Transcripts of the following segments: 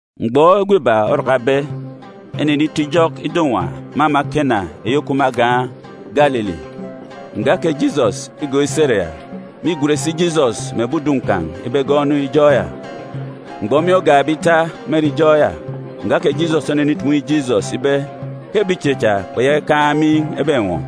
Mgbọ egwe iba orakabe, enenito ijọk ido-nwa me ama Kena eyi òkup me agan̄ Galili. Nga kè Jisọs îgọọk isi ere ya. Mîgwen si Jisọs mè ebi udun̄ kan̄ ibe egọọk enu ijọk ya. Mgbọ miin̄ ogakbe ene ita me ere ijọk ya, nga kè Jisọs onenitumu inyi Jisọs ibe ke ebi ichen cha kpeyaka ikaan̄ miin̄ ebenwọ.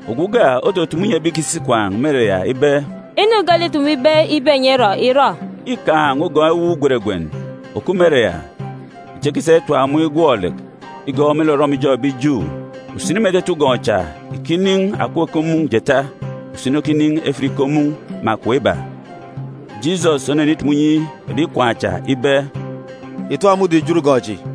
Ogwu uga otutumu inyi ebi ìkisi ikwaan̄ me ere ya ibe, “Inu geelek îtumube ibe enyi erọ, ìrọ.” Îkaan̄ ugọn̄ ewuuk gweregwen òkup me ere ya, echi ekisa itap mun̄ igwọk lek igọọk me lek orọmijọn̄ ebi Ju. Usini me etete ugọn̄ cha îkinin̄ akọp iko mun̄ jeeta, usini okinin̄ efit iko mun̄ mè akọp iba. Jisọs onenitumu inyi ebi ikwaan̄ cha ibe, “Ìtap mudim ìjot ugọn̄ chi.”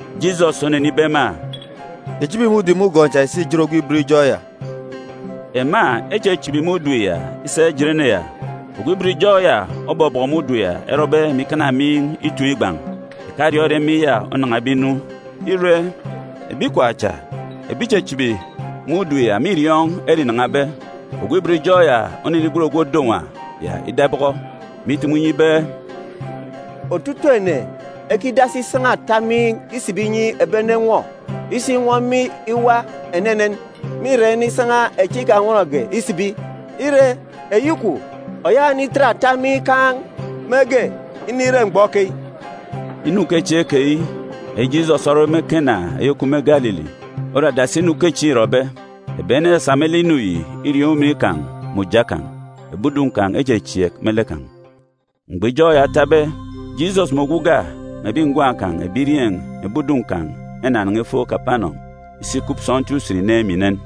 Jisọs onenibe ema, “Ìchibi usini me lek ìsa ìjet ogwu ibot ijọk ya.” Ema echichibi isa ijet ene ya. Ogwu ibot ijọk ya obọbọkọ mudim ya erọbe mè ikana miin̄ ituun̄ ikpọ. Ìkariọọn̄ ere miin̄ ya onan̄abe inu. Ire, ebi ikwaan̄ cha ebi ìchichibi mudim ya mîriọọn̄ ere înan̄abe. Ogwu ibot ijọk ya onenigwen ogwu òdo nwa ya ida ibọkọ, mè itumu inyi ibe, “Otutuuk ene ekidasi isan̄a ata miin̄ isibi inyi ebi ene enwọ. Isinwọ miin̄ iwa enenen, mîra inisan̄a echi ikanwọnge isibi. Ire, eyi kwun̄, òyaka ìnitet ata miin̄ ikaan̄ mege inire mgbọ keyi.” Inu ukechieen̄ keyi, eyi Jisọs orọbe me Kena eyi òkup me Galili, ore adasi inu ukechieen̄ îrọbe. Ebi ene esasa me lek inu yi iriọọn̄ ujamgbugbo kan̄. Ebi udun̄ kan̄ echechieek me lek kan̄. Mgbọ ijọk ya otabe, Jisọs mè ogwu uga mè ebi ngwan̄ kan̄ ebirieen̄ mè ebi udun̄ kan̄ enanan̄a ifo Kapanọm isi ikup sọntiik usen inen mè inen.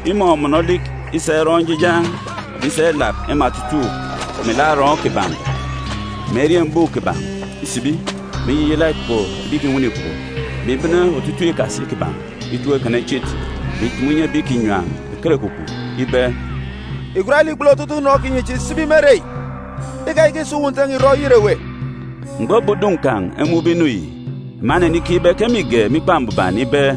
Imọmọnọ olik isa irọ njijan̄, mè isa ilap ema otutuuk melek arọọn̄ kiban̄, mè eriembuuk kiban̄ isibi, mè iyiyala ikpoko ebi ìkinwene ikpoko, mè ibene otutuuk ikasi kiban̄ itọp ikana ichit, mè itumu inyi ebi ìkinyam ekerekwukwu ibe, “Ìgwat lek ìkpulu otutuuk unọn kinyi chi ìsibi me ere yi! Ikayaka ìsa uwu Nte n̄a ìrọ oyet ewe!” Mgbọ ebi udun̄ kan̄ emun̄be inu yi, ema enenikeek ibe ke mîge me Ikpa Mbuban ibe,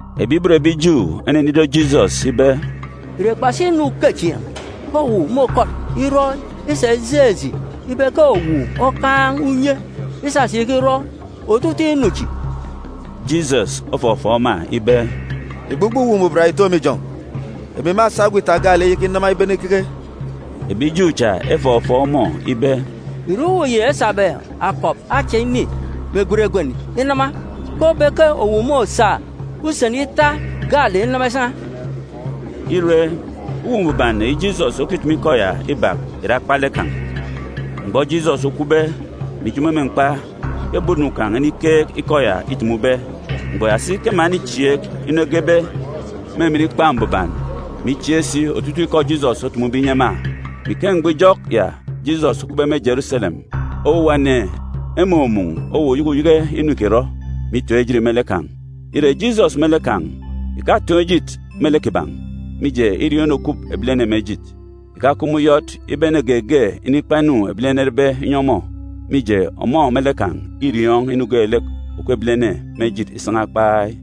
Ebi ibot ebi Ju enenido Jisọs ibe, “Ìre kpasi inu ukechieen̄ ke owu môkọt irọ isa ijeen̄ eji ibe ke owu okaan̄ unye isasa ikirọ otutuuk inu chi?” Jisọs ofọfọọk ema ibe, “Ìgbugbọ Uwu Mbuban yi ìto me ijọn̄. Emi mâsa egwe ita gaalek iyaka inama ibene ikeke.” Ebi Ju cha efọfọọk ọmọ ibe, “Ìre uwu yi esabe akọp acha ini mè gweregwen inama ke obe ke owu môsa usen ita gaalek inama isan̄a?” Ire, Uwu Mbuban eyi Jisọs okitumu ikọ ya ibak ìre akpalek kan̄. Mgbọ Jisọs okwube, mè ijomo me mkpa ke ebi udun̄ kan̄ enikeek ikọ ya îtumube. Mgbọ ya si ke ema enichieek inu egebe me emen Ikpa Mbuban, mè ichieek si otutuuk ikọ Jisọs otumube inyi ema. Me ike mgbọ ijọk ya Jisọs okupbe me Jeruselem, owuwa ene emumun̄ owuwa uyeke uyeke inu îkirọ, mè itoon̄ ejit me lek kan̄. Ire, Jisọs me lek kan̄ ìkatoon̄ ejit me lek kiban̄, mije, îriọọn̄ inu òkup ebilene me ejit. Ìkakup me uyọt ibe ene geege inikpa inu ebilene erebe inyi ọmọ, mije, ọmọ me lek kan̄ îriọọn̄ inu geelek òkup ebilene me ejit isan̄a kpai.